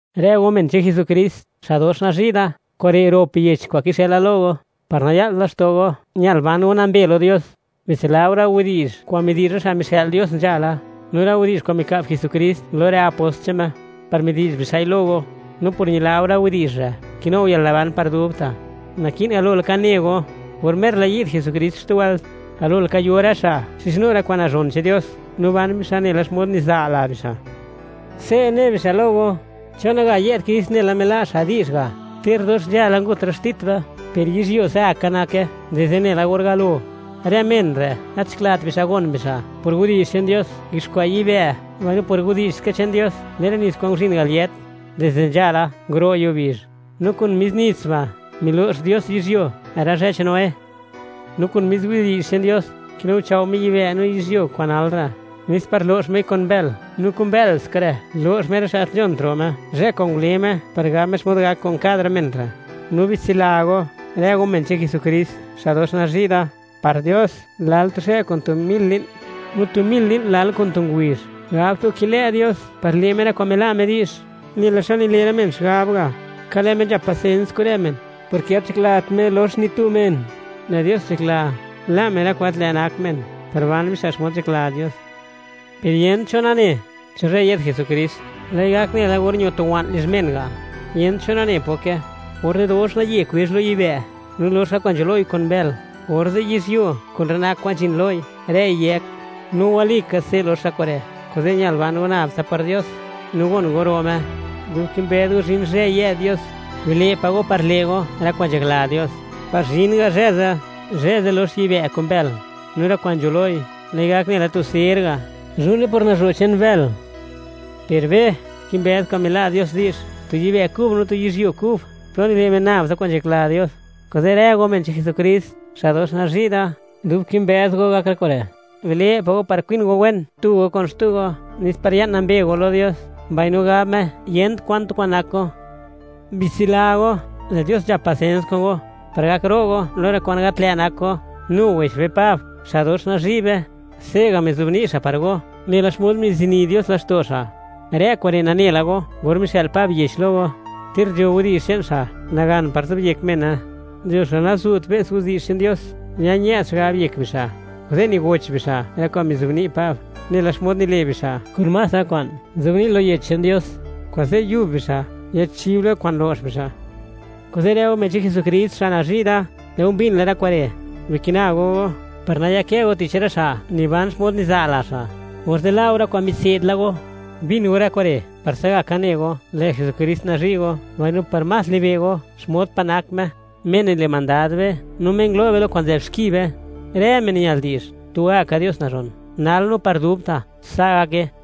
Rë go men che'n Jesukrist, xa' dox nazhi' da; kure' rop yech kwa'n kixëla lo go, par naya'lt laxto' go, ñal ban go nambe lo Dios. Bitsila go rë widi'zh kwa'n midi'zh rë xa' mixë'l Dios nzhala, no rë widi'zh kwa'n mika'b Jesukrist lo rë apost che'n Me, par midi'zh bixa'i lo go; no por ñila go rë widi'zh re', kinu go yalnaban par dubta'. Naki'n galo laka ne go: or mer la yi'd Jesukrist xtu wëlt, galo laka yo rë xa' xizhnu rë kwa'n nazhon che'n Dios, no ban bixa' nela xmod niza' la bixa'. Se' ne bixa' lo go: “¿Chon naga yë'd Krist, nela mila' xa' di'zh ga'? Ter dox nzhala ngut rë xtit be, per yizhyuo se'gaka nake dizde nela or galo.” Rë men re', gat nzhaklat bixa' gon bixa', por widi'zh che'n Dios, nguiuxkwa' yibë'; mbaino por widi'zh ska che'n Dios, le'n rë nits kwa'n nguzhin al yët dizde nzhala, nguro' yuo bizh. No kun mis nits ba' milo'x Dios yizhyuo rë zhë che'n Noé. No kun mis widi'zh che'n Dios, kinuchao' Me yibë' no yizhyuo kwa'n nal re', nes par lox Mei kun bël; no kun bël ska re' lo'x Me rë xa' gat nzhont ro' Me, zhë kwa'n ngule Me par gab Me xmod gak kun kad rë men re'. No bitsila go, rë go men che'n Jesukrist, xa' dox nazhi' da; par Dios, lal tu zhë kun tu mil li'n, no tu mil li'n lal kun tu ngubizh. Gabt go kilë' Dios par le' Me rë kwa'n mila' Me di'zh, nela xa nile' rë men xigab ga'. Ka lë' Me, nzhap pasens kun rë men, porke gat nzhaklat Me lox ni tu men; lë' Dios nzhakla, la' men rë kwa'n gat lë' nak men, par ban bixa' xmod nzhakla Dios. Per yent cho nane, cho zhë yë'd Jesukrist, lë'i gak nela or ño tu wa'n lizh men ga', yent cho nane poke; orze' dox naye kwezh lo yibë', no lox rë kwa'n nzho loi kun bël; orze' yizhyuo kun rë nak kwa'n nzhin loi, rëi yëk. No walika, se' lox rë kure', kuze' ñal ban go nab tsa par Dios, no gon go ro' Me. Dub kimbëz go zhin zhë yë'd Dios, bile' pa' go par le' go rë kwa'n nzhakla Dios, par zhin ga zhë ze'. Zhë ze' lox yibë' kun bël; no rë kwa'n nzho loi, lë'i gak nela tu ser ga', zhu'ne por nazho' che'n bël. Per be, kimbëz kwa'n mila' Dios di'zh, tu yibë' kub no tu yizhyuo kub, plo nile' men nab tsa kwa'n nzhakla Dios. Kuze' rë go men che'n Jesukrist, xa' dox nazhi' da, dub kimbëz go gak rë kure', bile' pa' go par kwin go wen tu go kun xtu go nes par ya'n nambe go lo Dios, mbaino gab Me yent kwan tu kwa'n nak go. Bitsila go, lë' Dios nzhap pasens kun go, par gak ro' go lo rë kwa'n gat lë' nak go; nu wech be Pab, xa' dox nazhi' be, se'ga' mizobni' xa' par go, nela xmod mizini Dios laxto' xa'. Rë kure' nane la go or mixë'l Pab yech lo go, ter nzho widi'zh che'n xa' nagan par zobyek mene. Nzho xa' nazu't be's widi'zh che'n Dios, ña-ñë'd xigab yek bixa', kuze' nigoch bixa' rë kwa'n mizobni' Pab, nela xmod nile' bixa' kun más rë kwa'n nzobni' lo yech che'n Dios; kuze' yub bixa' yachib lo kwa'n lo'x bixa'. Kuze', rë go men che'n Jesukrist xa' nazhi' da, lë' go mbin la rë kure'; bikina go go, par nayakë go tich rë xa' niban xmod niza' la xa', orze' la' go rë kwa'n mitse'd la go. Bin go rë kure' par se'gaka ne go lë' Jesukrist nazhi' go, mbaino par más libe' go xmod pa' nak Me, Me nile' mandad be no Me ngulo' be lo kwa'n nzë'b xki be. Rë men ñal di'zh, tugaka Dios nazhon, nal no par dubta'. Sa' gake.